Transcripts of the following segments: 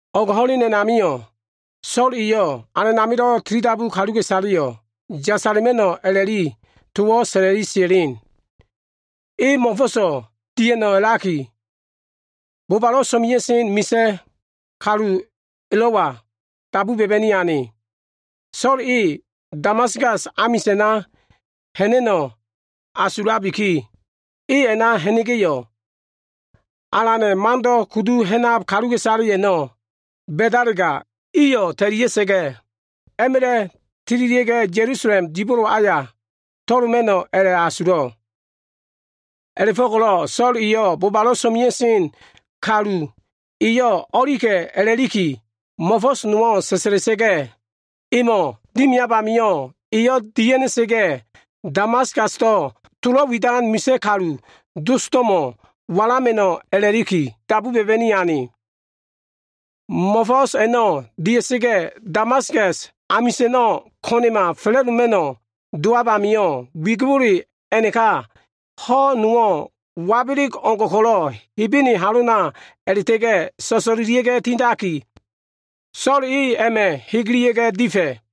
O꞉g ho꞉len a꞉namio꞉ So꞉l eyo꞉ Alan amilo꞉ tilidabu kaluka꞉isaleyo꞉ yasala꞉ma꞉no꞉ a꞉la꞉liki towo꞉ sa꞉la꞉li sia꞉len. E mo꞉fo꞉so꞉ dia꞉no꞉ a꞉la꞉liki, bobalo꞉ so꞉mea꞉sen misa꞉ kalu elo꞉wa dabu ba꞉ba꞉ni ane. So꞉l e Damaskas amisa꞉na ha꞉na꞉no꞉ asulabiki, e a꞉na ha꞉na꞉ga꞉yo꞉, Alana꞉ Mando꞉ kudu ha꞉nab kaluka꞉isale a꞉no꞉ ba꞉dalega, iyo꞉ ta꞉lia꞉sa꞉ga꞉, a꞉ma꞉la꞉ tililia꞉ga꞉, Ya꞉lusalem dibolo aya to꞉loma꞉no꞉ a꞉la꞉asulo꞉. A꞉la꞉fo꞉ko꞉lo꞉ So꞉l eyo꞉ bobalo꞉ so꞉mea꞉sen kalu eyo꞉ o꞉lika꞉ a꞉la꞉liki mo꞉fo꞉s nowo꞉ sa꞉sa꞉la꞉sa꞉ga꞉, emo꞉ dimiab amio꞉, eyo꞉ dia꞉ha꞉na꞉sa꞉ga꞉ Damaskasdo꞉ tolo꞉ widan misa꞉ kalu dosdo꞉mo꞉ walama꞉no꞉ a꞉la꞉liki, dabu ba꞉ba꞉ni ane. Mo꞉fo꞉s a꞉no꞉ dia꞉sa꞉ga꞉, Damaskas amisa꞉no꞉ ko꞉na꞉ma fa꞉la꞉doma꞉no꞉ dowab amio꞉, wigibole a꞉naka ho꞉ nowo꞉ wabeleg o꞉ngo꞉ ko꞉lo꞉ Hebene halona a꞉la꞉ta꞉ga꞉ so꞉so꞉lelia꞉ga꞉ tindaki, So꞉l e a꞉ma꞉ hegelia꞉ga꞉ difa꞉.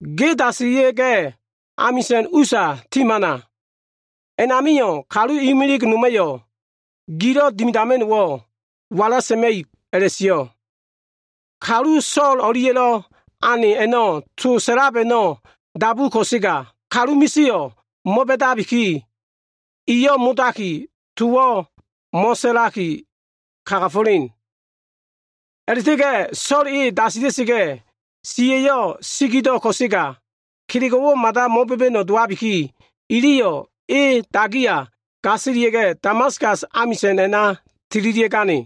Ge dasilia꞉ga꞉, amisa꞉n usa ti hamana. A꞉namio꞉, kalu imilig noma꞉yo꞉ gilo꞉ dimidama꞉no꞉wo꞉ wala sa꞉ma꞉ib” a꞉la꞉sio꞉. Kalu So꞉l o꞉lia꞉lo꞉ ane iliyo꞉ to sa꞉lab a꞉no꞉ dabu ko꞉sega, kalu misio꞉ mo꞉ba꞉dabiki, iyo꞉ modaki tolo꞉ mo꞉sa꞉ma꞉no꞉ dowo꞉. A꞉la꞉ta꞉ga꞉ So꞉l e dasila꞉sa꞉ga꞉ siya꞉yo꞉ sigido꞉ ko꞉sega, kelego꞉wo꞉ mada mo꞉ba꞉ba꞉no꞉ dowabiki, iliyo꞉ e dagiya gasilia꞉ga꞉, Damaskas amisa꞉n a꞉na tililia꞉gane.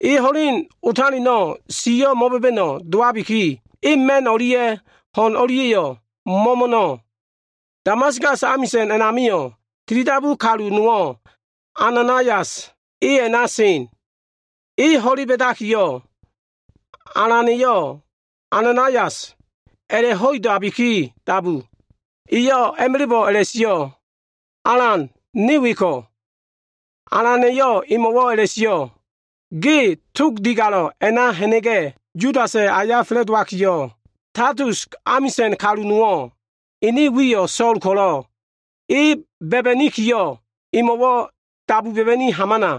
E ho꞉len otaleno꞉ siyo꞉ mo꞉ba꞉ba꞉no꞉ dowabiki, e ma꞉n o꞉lia꞉ ho꞉n o꞉lia꞉yo꞉ mo꞉mo꞉no꞉. Damaskas amisa꞉n a꞉namio꞉ tilidabu kalu nowo꞉, Ananaias e a꞉na sen. E ho꞉le ba꞉dakiyo꞉, Alana꞉yo꞉ “Ananaias!” a꞉la꞉ho꞉idabiki dabu. Eyo꞉ a꞉ma꞉la꞉bo꞉ a꞉la꞉sio꞉, “Alan, ne weko꞉.” Alana꞉yo꞉ emo꞉wo꞉ a꞉la꞉sio꞉, “Ge Tog Digalo꞉ a꞉na ha꞉na꞉ga꞉, Yudasa꞉ aya fa꞉la꞉dowakiyo꞉, Tasus amisa꞉n kalu nowo꞉ ene wiyo꞉ So꞉l ko꞉lo꞉, e ba꞉ba꞉nikiyo꞉, emo꞉wo꞉ dabu ba꞉ba꞉ni hamana.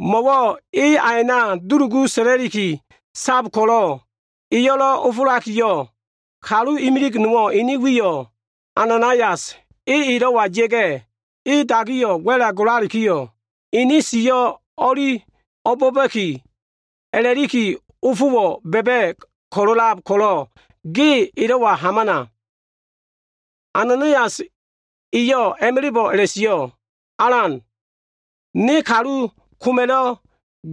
Mo꞉wo꞉ e a a꞉na dulugu sa꞉la꞉liki sab ko꞉lo꞉ eyo꞉lo꞉ ofolakiyo꞉, kalu imilig nowo꞉ ene wiyo꞉ Ananaias, e elo꞉wa ya꞉ga꞉, e dagiyo꞉ wa꞉la golalikiyo꞉, ene siyo꞉ o꞉li o꞉bo꞉ba꞉ki a꞉la꞉likiyo꞉ ofowo꞉ ba꞉ba꞉ ko꞉lo꞉lab ko꞉lo꞉, ge elo꞉wa hamana.” Ananaias eyo꞉ a꞉ma꞉la꞉bo꞉ a꞉la꞉sio꞉, “Alan, ne kalu koma꞉lo꞉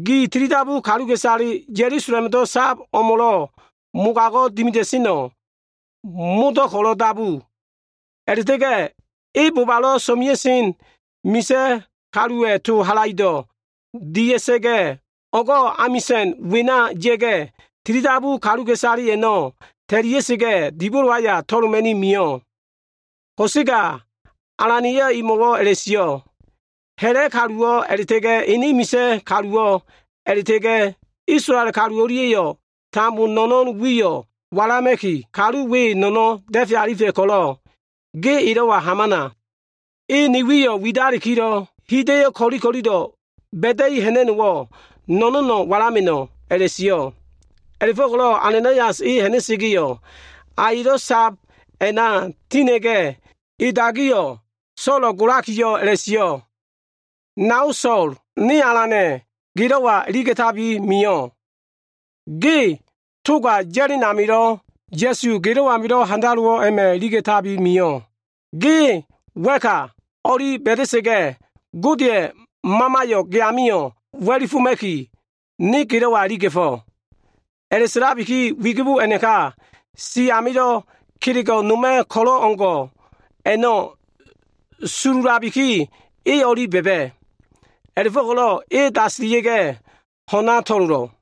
gi tilidabu kaluka꞉isale Ya꞉lusalemdo꞉ sab o꞉mo꞉lo꞉ mogago꞉ dimida꞉seno꞉ modo꞉ ko꞉lo꞉ dabu. A꞉la꞉ta꞉ga꞉ e bobalo꞉ so꞉mea꞉sen misa꞉ kaluwa꞉ to halaido꞉ saefa꞉ a꞉no꞉ dia꞉sa꞉ga꞉, o꞉go꞉ amisa꞉n wena ya꞉ga꞉, tilidabu kaluka꞉isale a꞉no꞉ ta꞉lia꞉sa꞉ga꞉, dibolo aya to꞉loma꞉ni mio꞉.” Ko꞉sega Alana꞉yo꞉ emo꞉wo꞉ a꞉la꞉sio꞉, “Ha꞉la꞉ kaluwo꞉ a꞉la꞉ta꞉ga꞉ ene misa꞉ kaluwo꞉, a꞉la꞉ta꞉ga꞉ Isolael kalu o꞉lia꞉yo꞉ tambo no꞉no꞉n wiyo꞉ walama꞉ki, kalu we no꞉no꞉n da꞉fe alifa꞉ ko꞉lo꞉ ge elo꞉wa hamana. E ni wiyo꞉ widalikilo꞉, hida꞉yo꞉ ko꞉li ko꞉lilo꞉ ba꞉da꞉i ha꞉na꞉no꞉wo꞉, no꞉no꞉no꞉ walama꞉no꞉” a꞉la꞉sio꞉. A꞉la꞉fo꞉ko꞉lo꞉ Ananaias e ha꞉na꞉sa꞉ga꞉yo꞉, a elo꞉ sab a꞉na tina꞉ga꞉, e dagiya꞉yo꞉ Solo꞉ golakiyo꞉ a꞉la꞉sio꞉, “Nao So꞉l, ne Alana꞉yo꞉ gelo꞉wa iliga꞉tabi mio꞉. Ge toga ya꞉len amilo꞉, Ya꞉su gelo꞉ amilo꞉ handalowo꞉ a꞉ma꞉ iliga꞉tabi mio꞉. Ge wa꞉ka o꞉li ba꞉da꞉sa꞉ga꞉, Godeya꞉ Mamayo꞉ ge amio꞉ wa꞉lifoma꞉ki, ne gelo꞉wa iliga꞉fo꞉.” A꞉la꞉sa꞉labiki, wigibo a꞉naka si amilo꞉ kelego꞉ noma꞉ ko꞉lo꞉ o꞉ngo꞉ a꞉no꞉ sululabiki, e o꞉li a꞉ba꞉ba꞉. A꞉la꞉fo꞉ko꞉lo꞉ e dasilia꞉ga꞉ ho꞉na to꞉lolo꞉.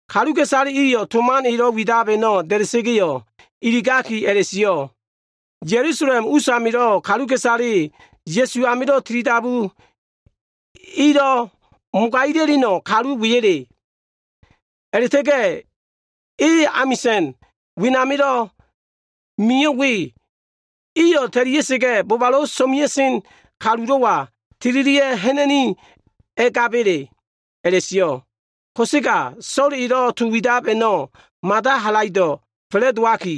Kaluka꞉isale iyo꞉ to man elo꞉ widab a꞉no꞉ da꞉da꞉ga꞉, iligakiyo꞉ a꞉la꞉sio꞉, “Ya꞉lusalem usamilo꞉ kaluka꞉isale Ya꞉su amilo꞉ tilidabu ilo꞉ mogagila꞉leno꞉ kalu weyele? A꞉la꞉ta꞉ga꞉ e amisa꞉n wenamilo꞉ mio꞉ we, iyo꞉ ta꞉lia꞉sa꞉ga꞉, bobalo꞉ so꞉mea꞉sen misa꞉ kalulo꞉wa tililia꞉ ha꞉na꞉ni a꞉ngaba꞉le?” a꞉la꞉sio꞉. Ko꞉sega So꞉l elo꞉ to widab a꞉no꞉ mada halaido꞉ fa꞉la꞉dowaki,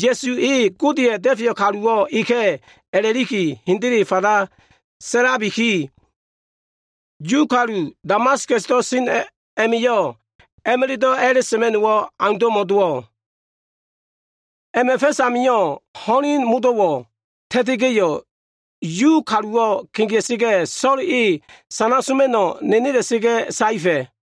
Ya꞉su E Godeya꞉lo꞉ Da꞉feyo꞉ Kaluwo꞉ Eka꞉ a꞉la꞉liki hendele fanda sa꞉labiki, Yu kalu Damaskasdo꞉ sen a꞉ma꞉yo꞉, a꞉ma꞉la꞉do꞉ a꞉la꞉sa꞉ma꞉no꞉wo꞉ aundo꞉ma dowo꞉. A꞉ma꞉ fa꞉s amio꞉, ho꞉len modo꞉wo꞉ ta꞉ta꞉sa꞉ga꞉yo꞉, Yu kaluwo꞉ kegea꞉sa꞉ga꞉, So꞉l e sana soma꞉no꞉ nenela꞉sa꞉ga꞉ saefa꞉.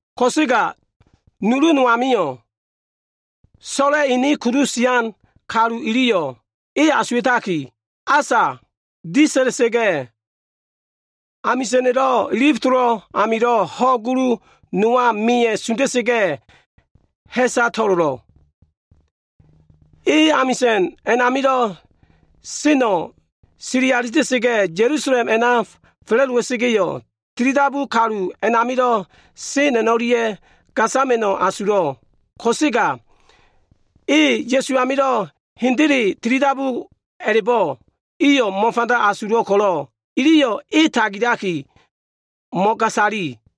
Ko꞉sega nulu no amio꞉, So꞉la꞉ enedo꞉ kudu sian kalu iliyo꞉ e asuwa꞉takiyo꞉, asa disa꞉la꞉sa꞉ga꞉, amisa꞉na꞉lo꞉ ilif tolo꞉ amilo꞉ ho꞉ gulu nowa meya꞉ sunda꞉sa꞉ga꞉, ha꞉sa to꞉lolo꞉. E amisa꞉n a꞉namilo꞉ seno꞉ sili alita꞉sa꞉ga꞉, Ya꞉lusalem a꞉na fa꞉la꞉dowa꞉sa꞉ga꞉yo꞉, tilidabu kalu a꞉namilo꞉ sen a꞉no꞉lia꞉ gasama꞉no꞉ asulo꞉ ko꞉sega, e Ya꞉su amio꞉ hendele tilidabu a꞉la꞉bo꞉, iyo꞉ mo꞉fanda asulo꞉ ko꞉lo꞉, iliyo꞉ e tagilaki e o꞉lia꞉yo꞉ mo꞉gasayo꞉.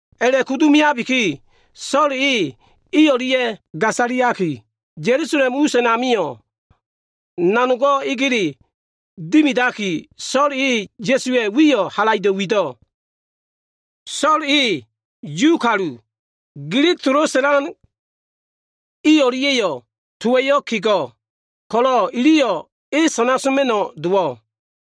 A꞉la꞉kudu meabiki, So꞉l eyo꞉ i o꞉lia꞉ gasaliaki, Ya꞉lusalem us a꞉namio꞉ nanogo꞉ egele dimidaki, So꞉l e Ya꞉suwa꞉ wiyo꞉ halaido꞉ wido꞉. So꞉l e Yu kalu, Gilig tolo꞉ sa꞉lan i o꞉lia꞉yo꞉ towa꞉yo꞉ kego꞉ ko꞉lo꞉, iliyo꞉ e sana soma꞉no꞉ dowo꞉.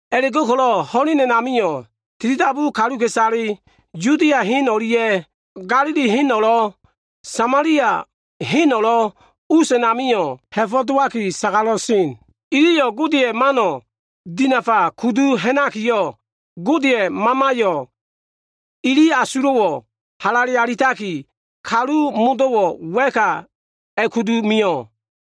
A꞉la꞉go꞉ko꞉lo꞉ ho꞉len a꞉namio꞉ tilidabu kaluka꞉isale, Yudia hen o꞉lia꞉ Ga꞉lili heno꞉lo꞉, Samalia heno꞉lo꞉ us a꞉namio꞉ ha꞉sa dowaki sagala꞉li sen. Iliyo꞉ Godeya꞉ mano꞉ dinafa kudu ha꞉nabikiyo꞉, Godeya꞉ Mamaya꞉yo꞉ ili asulo꞉wo꞉ halale alitaki, kalu modo꞉wo꞉ wa꞉ka a꞉kudu mio꞉.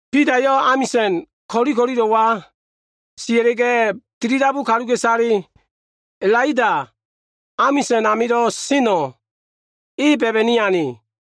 Bidayo꞉ amisa꞉n ko꞉li ko꞉lilo꞉wa sia꞉la꞉ga꞉, tilidabu kaluka꞉isale Lida amisa꞉n amilo꞉ seno꞉ e ba꞉ba꞉ni ane.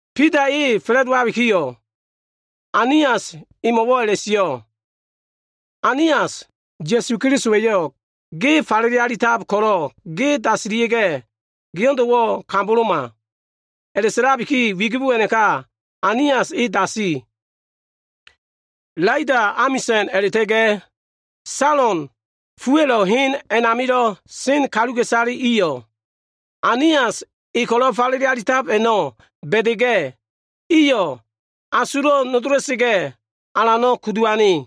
Bida e fa꞉la꞉dowakiyo꞉, Ainias emo꞉wo꞉ a꞉la꞉sio꞉, “Ainias, Ya꞉su Kelisowa꞉yo꞉ ge falele alitab ko꞉lo꞉ ge dasila꞉sa꞉ga꞉, geo꞉ndo꞉wo꞉ kamboloma.” A꞉la꞉sa꞉labiki, wigibo a꞉naka Ainias e dasi. Lida amisa꞉no꞉ a꞉la꞉ta꞉ga꞉ Salon fua꞉lo꞉ hen a꞉namilo꞉ sen kaluka꞉isale iyo꞉, Ainias e ko꞉lo꞉ falele alitab a꞉no꞉ ba꞉da꞉ga꞉, iyo꞉ asulo꞉wo꞉ nodola꞉sa꞉ga꞉, Alano꞉ kudu ane.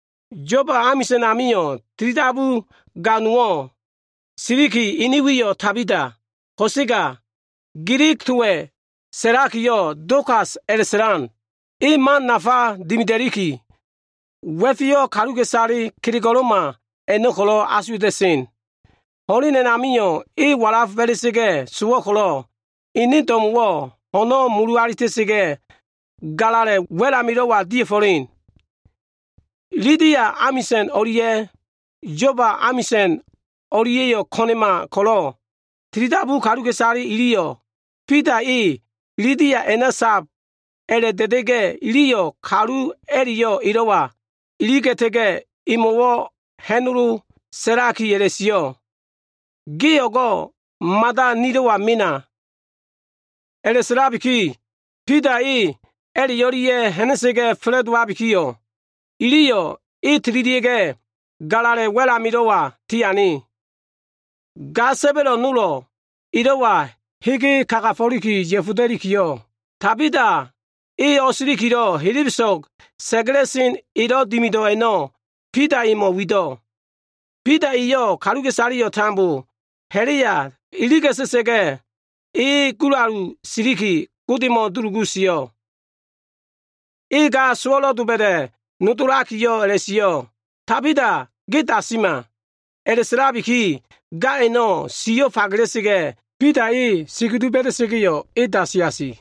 Yoba amisa꞉n amio꞉ tilidabu ga nowo꞉ a꞉na sen. Ene wiyo꞉ Tabita, ko꞉sega Gilig towa꞉ sa꞉lakiyo꞉, Dokas a꞉la꞉sa꞉la꞉sen. E man nafa dimida꞉likiyo꞉, wa꞉feyo꞉ kaluka꞉isale kelego꞉lo꞉ma a꞉no꞉ ko꞉lo꞉ asuwa꞉ta꞉sen. Ho꞉len a꞉namio꞉ e walaf ba꞉la꞉sa꞉ga꞉ sowo꞉ ko꞉lo꞉, ene do꞉mo꞉wo꞉ ho꞉no꞉ mulu alita꞉sa꞉ga꞉, galala꞉ wa꞉l amilo꞉wa dia꞉fo꞉len. Lida amisa꞉n o꞉lia꞉ Yoba amisa꞉n o꞉lia꞉yo꞉ ko꞉na꞉ma ko꞉lo꞉, tilidabu kaluka꞉isale iliyo꞉ Bida e Lida a꞉na saka꞉ a꞉la꞉da꞉da꞉ga꞉yo꞉, iliyo꞉ kalu a꞉la꞉yo꞉ elo꞉wa iliga꞉ta꞉ga꞉, emo꞉wo꞉ ha꞉nolo sa꞉lakiyo꞉ a꞉la꞉sio꞉, “O꞉go꞉ ge mada nilo꞉wa mena!” A꞉la꞉sa꞉labiki, Bida e a꞉la꞉ o꞉lia꞉ ha꞉na꞉ga꞉ fa꞉la꞉dowabikiyo꞉, iliyo꞉ e tililia꞉ga꞉, galala꞉ wa꞉l amilo꞉wa tiane. Ga sa꞉ba꞉lo꞉ nolo꞉ elo꞉wa hege kagafo꞉liki ya꞉foda꞉likiyo꞉, Tabita e o꞉silikilo꞉ helebeso꞉g elo꞉ dubio꞉ a꞉no꞉ Bida emo꞉ wido꞉. Bida eyo꞉ kaluka꞉isaleyo꞉ tambo ha꞉la꞉ya iliga꞉ta꞉sa꞉ga꞉, e gulalu siliki Godemo꞉ dulugu sio꞉. E ga sowo꞉lo꞉ doba꞉da꞉ nodolakiyo꞉ a꞉la꞉sio꞉, “Tabita, ge dasima!” A꞉la꞉sa꞉labiki, ga a꞉no꞉ siyo꞉ fagela꞉sa꞉ga꞉, Bida e sikudu ba꞉da꞉sa꞉ga꞉yo꞉, e dasi asi.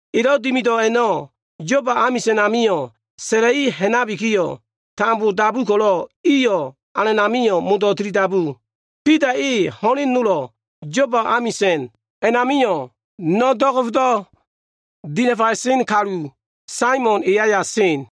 Elo꞉ dimido꞉ a꞉no꞉, Yoba amisa꞉n amio꞉ sa꞉la꞉i ha꞉nabikiyo꞉, tambo dabu ko꞉lo꞉, iyo꞉ Alan amio꞉ modo꞉ tilidabu. Bida e ho꞉len nolo꞉ Yoba amisa꞉n a꞉namio꞉, no꞉ do꞉go꞉fdo꞉ dinafaya꞉sen kalu, Saimon e aya sen.